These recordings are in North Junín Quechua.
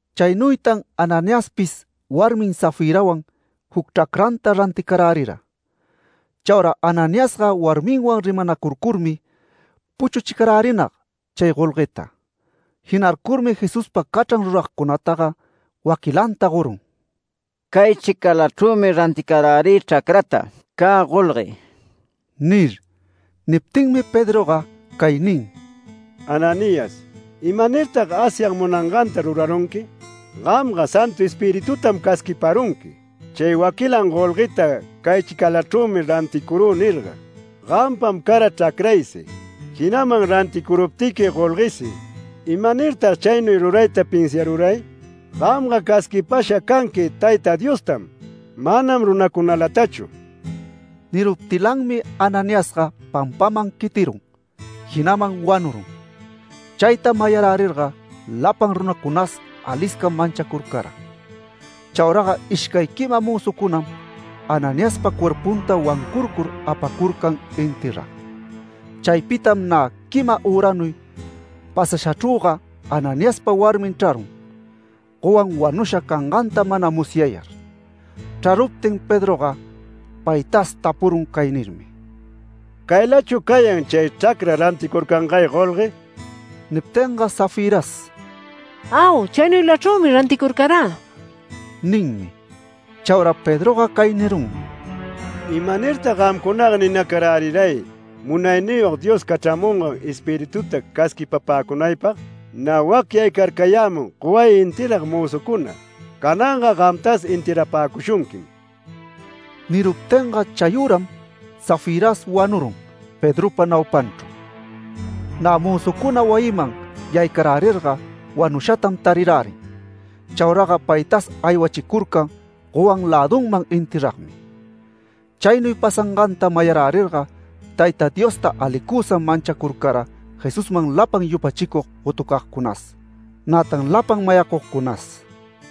Chaynuytan Ananiaspis warmin Safirawan juc chracranta ranticarärira. Chaura Ananiasga warminwan rimanacurcurmi puchuchicarärinag chay golgueta. Jinarcurmi Jesuspa cachran ruragcunataga waquilanta gorun “Caychicalachrümi ranticarärï chracrata. Cä golgue” nir. Niptinmi Pedroga cay nin: “Ananías, ¿imanirtag Asyag munanganta rurarunqui? Gamga Santu Espiritutam casquiparunqui ‘Chay waquilan golgueta caychicalachrümi ranticurü’ nirga. Gampam cara chracraysi, jinaman ranticuruptiqui golguesi. ¿Imanirtag chaynuy rurayta pinsiaruray? Gamga casquipasha canqui Tayta Diostam, manam runacunalatachu”. Niruptilanmi Ananiasga pampaman quitirun, jinaman wanurun. Chayta mayarärirga lapan runacunas aliscam manchacurcara. Chauraga ishcay quima mözucunam Ananiaspa cuerpunta wancurcur apacurcan enterrag. Chaypitam nä quima üranuy pasashachrüga Ananiaspa warmin chrarun, gowan wanusha canganta mana musyayar. Chraruptin Pedroga paytas tapurun cay nirmi: “¿Caylachu cayan chay chracra ranticurcangay golgue?” Niptinga Safiras “Au. Chaynuylachrümi ranticurcarä” ninmi. Chaura Pedroga cay nirunmi: “¿Imanirtag gamcunaga ninacaräriray Munayniyog Dios cachramungan Espirituta casquipapäcunaypag? Nä wac yaycarcayämun goway enterrag mözucuna, cananga gamtas enterrapäcushunquim”. Niruptinga chayüram, Safiras wanurun Pedropa naupanchru. Nä mözucuna wayiman yaycarärirga wanushatam tarirärin. Chauraga paytas aywachicurcan gowan lädunman enterragmi. Chaynuy pasanganta musyarärirga Tayta Diosta alicusam manchacurcara Jesusman lapan yupachicug gotucagcunas, nätan lapan mayacugcunas.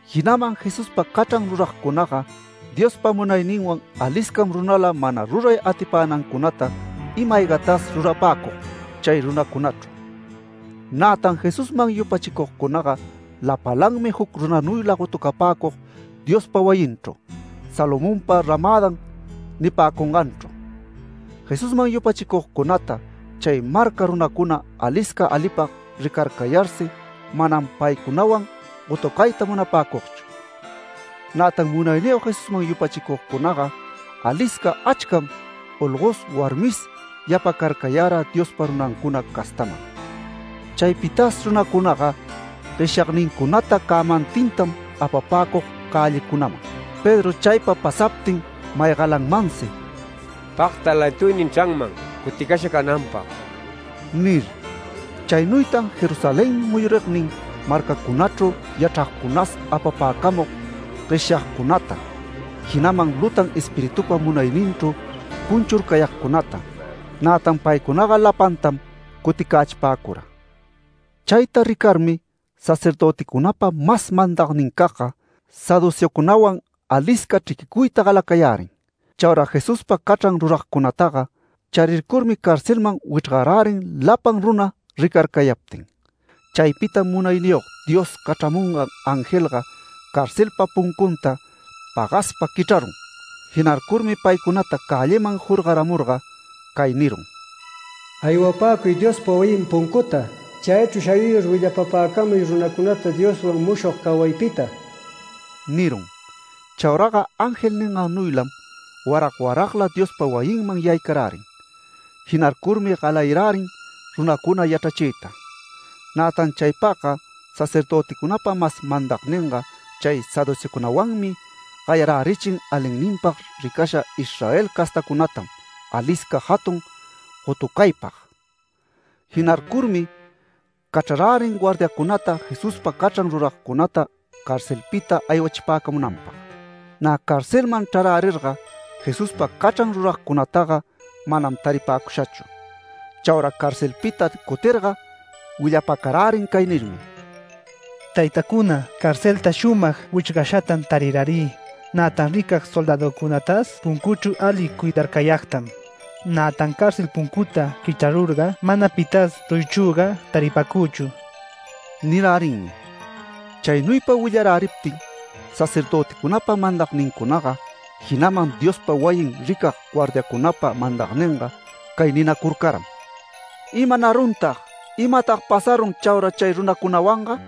Jinaman Jesuspa cachran ruragcunaga Diospa munayninwan aliscam runala mana ruray atipänancunata ima-aygatas rurapäcug chay runacunachru. Nätan Jesusman yupachicugcunaga lapalanmi juc runanuyla gotupäcug Diospa wayinchru, Salomonpa ramädan nipäcunganchru. Jesusman yupachicugcunata chay marca runacuna alisca alipag ricarcayarsi manam paycunawan gotucayta munapäcugchu. Nätan Munayniyog Jesusman yupachicugcunaga alisca achcam olgos warmis yapacarcayara Diospa runancuna castaman. Chaypitas runacunaga gueshyagnincunata cämantintam apapäcug cällicunaman, Pedro chaypa pasaptin maygalanmansi “Pagta lantuynin chranman cuticasha cananpag” nir. Chaynuytan Jerusalén muyurignin marcacunachru yachragcunas apapäcamug gueshyagcunata, jinaman lutan espiritupa munayninchru cunchurcayagcunata. Nätan paycunaga lapantam cuticächipäcura. Chayta ricarmi sacerdöticunapa mas mandagnincagga, saduceocunawan alisca chriquicuyta galacayärin. Chaura Jesuspa cachran ruragcunataga charircurmi carcelman wichrgarärin lapan runa ricarcayaptin. Chaypitam Munayniyog Dios cachramungan angelga carcelpa puncunta pagaspa quichrarun. Jinarcurmi paycunata cälliman jorgaramurga cay nirun: “Aywapäcuy Diospa wayin puncuta. Chaychru shayuyur willapapäcamuy runacunata Dioswan mushog cawaypita” nirun. Chauraga ángel ningannuylam warag waragla Diospa wayinman yaycarärin. Jinarcurmi galayarärin runacuna yachrachiyta. Nätan chaypagga sacerdöticunapa mas mandagninga chay saduceocunawanmi gayarärichin alinninpag ricasha Israel castacunatam alisca jatun gotucaypag. Jinarcurmi cachrarärin guardiacunata Jesuspa cachran ruragcunata carcelpita aywachipäcamunanpag. Nä carcelman chrarärirga Jesuspa cachran ruragcunataga manam taripäcushachu. Chaura carcelpita cutirga willapacarärin cay nirmi: “Taytacuna, carcelta shumag wichrgashatam tarirärï. Nätan ricag soldäducunatas puncuchru ali cuidarcayagtam. Nätan cárcel puncuta quichrarurga manam pitas ruyichrüga taripäcüchu” nirärinmi. Chaynuypa willaräriptin sacerdöticunapa mandagnincunaga, jinaman Diospa wayin ricag guardiacunapa mandagninga cay ninacurcaram: “¿Imanaruntag? ¿Imatag pasarun chaura chay runacunawanga?”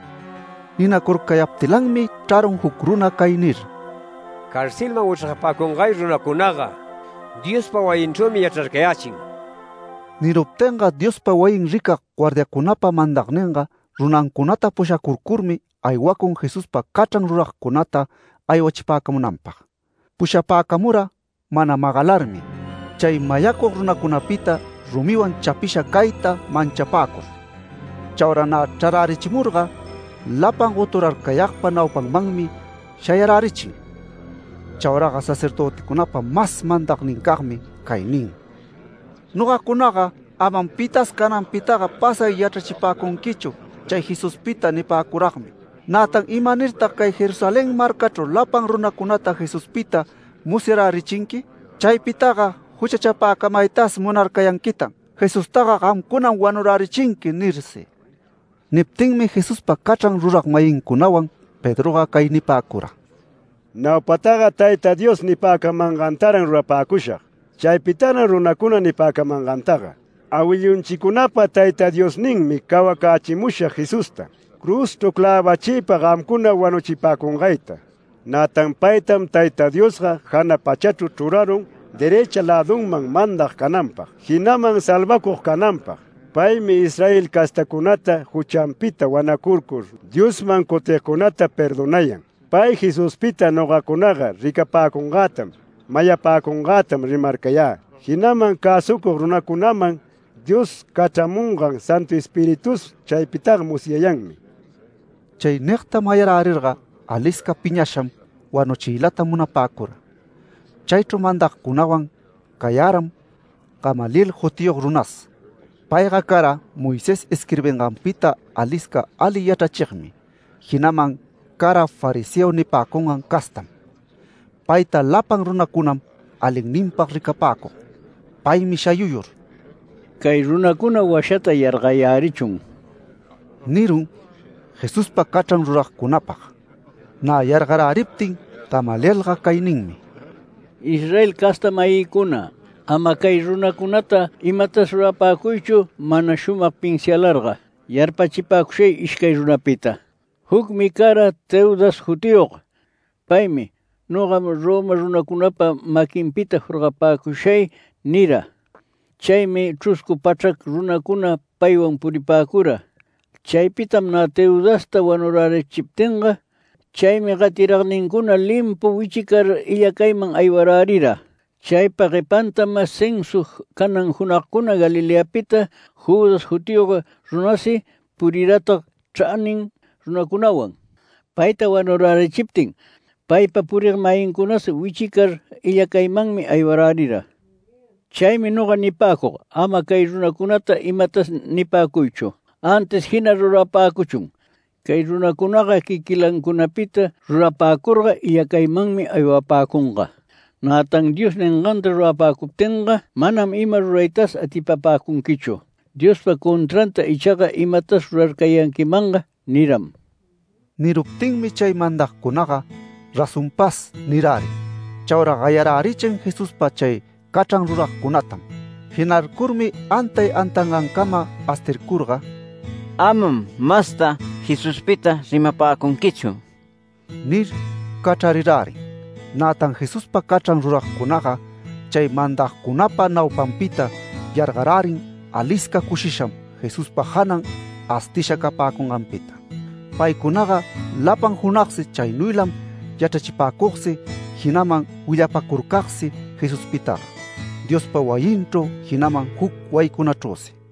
Ninacurcayaptilanmi chrarun juc runa cay nir: “Carcelman wichrgapäcungay runacunaga Diospa wayinchrümi yachrarcayächin”. Niruptinga Diospa wayin ricag guardiacunapa mandagninga runancunata pushacurcurmi aywacun Jesuspa cachran ruragcunata aywachipäcamunanpag. Pushapäcamura mana magalarmi, chay mayacug runacunapita rumiwan chapisha cayta manchapäcur. Chaura nä chrarärichimurga, lapan goturarcayagpa naupanmanmi shayarärichin. Chauraga sacerdöticunapa mas mandagnincagmi cay nin: “Nogacunaga ‘Amam pitas cananpitaga pasay yachrachipäcunquichu chay Jesuspita’ nipäcuragmi. Nätan ¿imanirtag cay Jerusalén marcachru lapan runacunata Jesuspita musyarärichinqui? Chaypitaga juchachapäcamaytas munarcayanquitan ‘Jesustaga gamcunam wanurärichinqui’ nirsi”. Niptinmi Jesuspa cachran rurag-mayincunawan Pedroga cay nipäcura: “Naupataga Tayta Dios nipäcamangantaran rurapäcushag, chaypitaran runacuna nipäcamangantaga. Awillunchicunapa Tayta Diosninmi cawacächimusha Jesusta, cruzchru clävachiypa gamcuna wanuchipäcungayta. Nätan paytam Tayta Diosga jana pachachru chrurarun derëcha lädunman mandag cananpag, jinaman salvacug cananpag. Paymi Israel castacunata juchanpita wanacurcur Diosman cutigcunata perdonayan. Pay Jesuspita nogacunaga ricapäcungätam, mayapäcungätam rimarcayä, jinaman cäsucug runacunaman Dios cachramungan Santu Espiritus chaypitaga musyayanmi”. Chay nigta mayarärirga alisca piñasham wanuchiylata munapäcura. Chaychru mandagcunawan cayaram Gamaliel jutiyog runas. Payga cara Moisés isquirbinganpita alisca ali yachrachigmi, jinaman cara fariseo nipäcungan castam. Payta lapan runacunam alinninpag ricapäcug. Paymi shayuyur “Cay runacuna washata yargayärichun” nirun, Jesuspa cachran ruragcunapag. Nä yargaräriptin Gamalielga cay ninmi: “Israel casta-mayïcuna, ama cay runacunata imatas rurapäcuychu mana shumag pinsialarga. Yarpachipäcushay ishcay runapita. Jucmi cara Teudas jutiyog. Paymi ‘Nogam Roma runacunapa maquinpita jorgapäcushay’ nira. Chaymi chruscu pachrac runacuna paywan puripäcura. Chaypitam nä Teudasta wanurärichiptinga, chay gatiragnincuna limpu wichicar illacayman aywarärira. Chaypa guepantam censa canan junagcuna Galileapita Judas jutiyog runasi puriratag chranin runacunawan. Payta wanurärichiptin, paypa purig-mayincunas wichicar illacaymanmi aywarärira. Chaymi noga nipäcug: Ama cay runacunata imatas nipäcuychu, antis jina rurapächun. Cay runacunaga quiquilancunapita rurapäcurga illacaymanmi aywapäcunga. Nätan Dios ninganta rurapäcuptinga manam ima ruraytas atipapäcunquichu. Diospa contranta ichaga imatas rurarcayanquimanga” niram. Niruptinmi chay mandagcunaga “Razonpas” nirärin. Chaura gayarärichin Jesuspa chay cachran ruragcunatam. Jinarcurmi antay antangancama astircurga “Amam masta Jesuspita rimapäcunquichu” nir cachrarirärin. Nätan Jesuspa cachran ruragcunaga chay mandagcunapa naupanpita yargarärin alisca cushisham Jesuspa janan astisha capäcunganpita. Paycunaga lapan junagsi chaynuylam yachrachipäcugsi jinaman willapacurcagsi Jesuspitaga, Diospa wayinchru jinaman juc wayicunachrüsi.